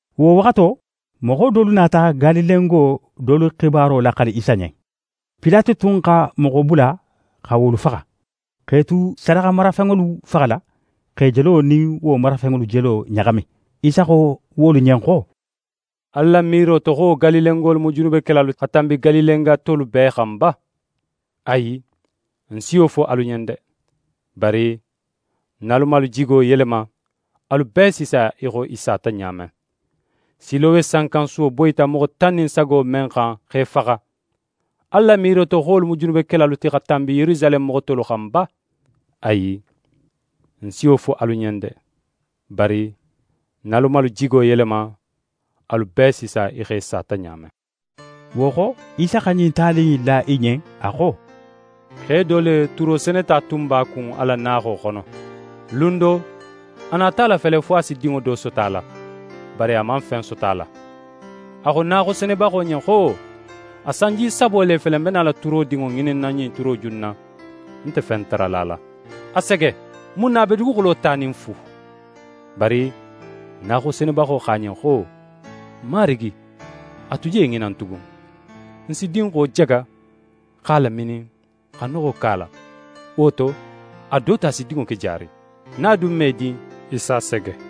Wo waxato, moxo dolu nata Galilengo dolu xibaro laxali Isa ɲen. Pilate tun xa moxo bula xa wolu faxa, x'e tu sadaxamarafenŋolu faxala, x'e jelo nin wo marafenŋolu jelo ɲaxami. Isa xo wolu ɲen xo: «Alu la miiro to xo wo Galilengolu mu junubekelalu ti xa tanbi Galilenga tolu bee xan ba? Ayi, ń si wo fo alu ɲen de! Bari nin alu man alu jigo yelema, alu bee si sa í xo i sata ɲa men. Silowe sankansuwo boyita moxo tan nin sago men xan x'e faxa, alu la miiro to xo wolu mu junubekelalu ti xa tanbi Yerusaleme moxo tolu xan ba? Ayi, ń si wo fo alu ɲen de! Bari nin alu man alu jigo yelema, alu bee si sa í xo i sata ɲa men.» Wo xo, Isa xa ɲin tali in la i ɲen, a xo: «Xe do le, turo seneta tun b'a kun a la naaxo xono. Lun do, a nata a lafele fo a si dinŋo do soto a la. Bari a man fen soto a la. A xo naaxo senebaxo ɲen xo: “A sanji sabo le fele, ń be nala turodinŋo ŋininna ɲin turoju in na, ń nte fen tarala a la. A sege! Mun na a be duguxulo tanin fu?” Bari naaxo senebaxo xo a ɲen xo: “Marigi, a tu je ŋinan tugun, ń si dinxo jaga x'a laminin, xa noxo ke a la. Wo to, a do to a si dinŋo ke jaari. Nin a dun man í din, í s'a sege.”»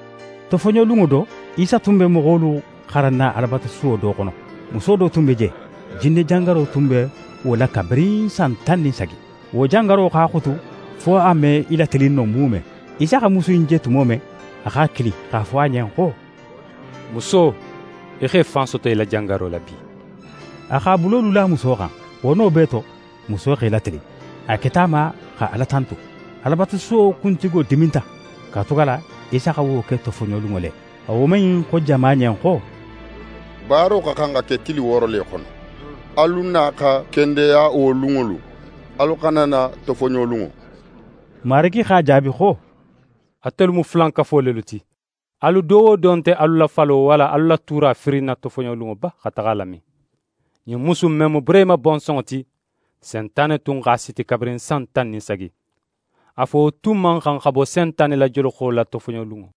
Tofoɲolunŋo do, Isa tun be moxolu xaranna Alabatusuwo do xono. Muso do tun be je, jinne jangaro tun be wo la kabirin san tan nin sagi. Wo jangaro x'a xutu fo a me í latilin no muume. Isa xa musu in je tumo men, a x'a kili x'a fo a ɲen xo: «Muso, í x'é fan soto í la jangaro la bi.» A x'a bulolu la muso xan. Wo no bee to, muso x'é latilin, a keta a ma xa Ala tantu. Alabatusuwo kuntigo diminta, katugala Isa xa wo ke tofoɲolunŋo le. A woman in xo jama ɲen xo: «Baaro xa xan xa ke tili wooro le xono. Alu na xa kendeya wo lunŋolu, alu xana na tofoɲolunŋo.» Marigi x'a jaabi xo: «Atelu mu fulankafo lelu ti. Alu do wo do nte alu la falo, walla alu la tuura firinna tofoɲolunŋo ba xa taxa a lamin? Ɲin musu in men mu Burehima bonsonŋo ti, Sentane tun x'a siti kabirin san tan nin sagi. A fo, wo tun man xan xa bo Sentane la joloxo la tofoɲolunŋo?»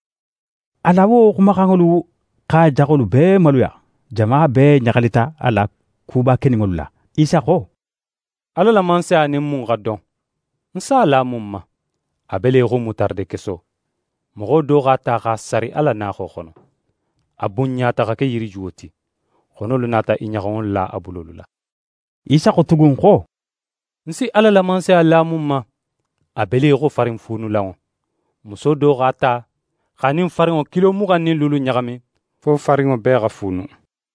A la wo xumaxanŋolu x'a jaxolu bee maluya. Jama bee ɲaxalita a la kuba keninŋolu la. Isa xo: «Ala la Mansaya nin mun xa don? Ń s'a la mun ma? A be le í xo mutaradekeso. Moxo do x'a ta x'a sari a la naaxo xono. A bunɲata xa ke yirijuwo ti. Xonolu nata i ɲaxanŋolu la a bulolu la.» Isa xo tugun xo: «Ń si Ala la Mansaya la mun ma? A be le í xo farinfuunulanŋo. Muso do x'a ta, x'a nin farinŋo kilo muxan nin luulu ɲaxami, fo farinŋo bee xa fuunu.»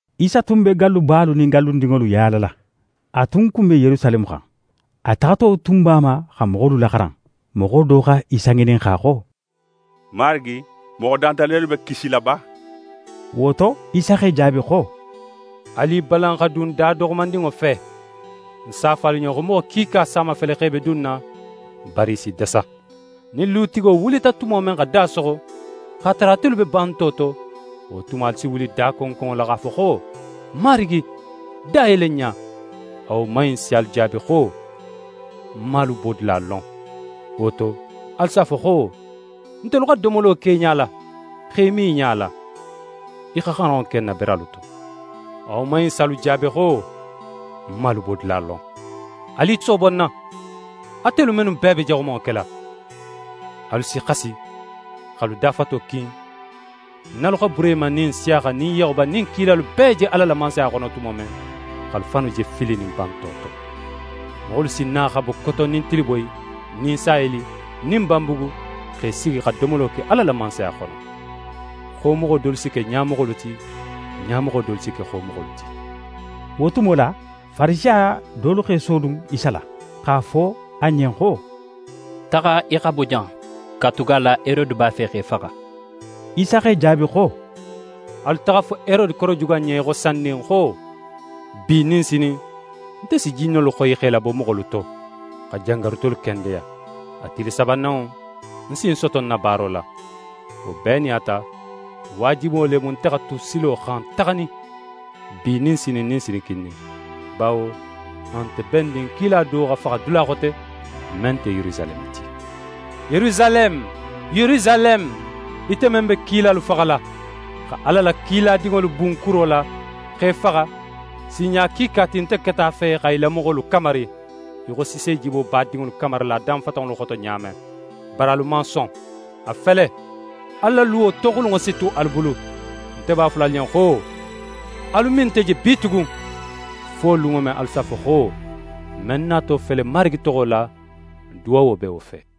Isa tun be gallubalu nin gallundinŋolu yaalala. A tun kun be Yerusaleme xan. A taxato tun b'a ma xa moxolu laxaran. Moxo do xa Isa ŋininxa xo: «Marigi, moxo danta lelu be kisila ba?» Wo to, Isa x'e jaabi xo: «Alu i balan xa dun da doxomandinŋo fe. Ń s'a fo alu ɲen xo moxo kiika s'a mafele x'e be dunna, bari i si dasa. Nin lutigo wulita tumo men xa da soxo, x'a tara atelu be banto to, wo tumo alu si wuli dakonkonŋo la x'a fo xo: “Marigi, da yele n ɲa.” A woman in si alu jaabi xo: “Ń man alu bodula lon.” Wo to, alu s'a fo xo: “Ntelu xa domolo ke í ɲala, x'e min í ɲala. Í xa xaranŋo ke n na beralu to.” A woman in si alu jaabi xo: “Ń man alu bodula lon. Alu i soobo ń na, atelu mennu bee be jaxumanŋo kela!” Alu si xasi x'alu dafato kin, nin alu xa Burehima, nin Nsiyaxa, nin Yaxuba, nin kilalu bee je Ala la Mansaya xono tumo men, x'alu fannu je filinin banto to. Moxolu si na xa bo koton nin tiliboyi nin saheli nin banbugu, x'e sigi xa domolo ke Ala la Mansaya xono. Xomoxo dolu si ke ɲamoxolu ti; ɲamoxo dolu si ke xomoxolu ti.» Wo tumo la, Farisiya dolu x'e sodun Isa la, x'a fo a ɲen xo: «Taxa í xa bo jan, katugala Herode b'a fe x'é faxa.» Isa x'e jaabi xo: «Alu taxa a fo Herode korojuga in ɲen í xo sandin xo: “Bi nin sinin, nte si jinnolu xoyi x'e labo moxolu to, xa jangarutolu kendeya. A tili sabananŋo, ń si ń soto ń na baaro la.” Wo bee nin a ta, waajibo le mu, nte xa tu silo xan taxanin, bi nin sinin nin sinikindin. Bawo a nte bennin kila do xa faxa dula xote, men nte Yerusaleme ti. «Yerusaleme, Yerusaleme, ite men be kilalu faxala, xa Ala la kiladinŋolu bun kuro la, x'e faxa, sinɲa kiika ti nte keta a fe xa í la moxolu kamari, í xo sisejibo b'a dinŋolu kamarila a danfatanŋolu xoto ɲa men. Bari alu man son. A fele, alu la luwo toxulunŋo si tu alu bulu. Nte b'a fola alu ɲen xo, alu me nte je bitugun, fo lunŋo men alu s'a fo xo: “Men nato fele Marigi toxo la, duwawo be wo fe!”»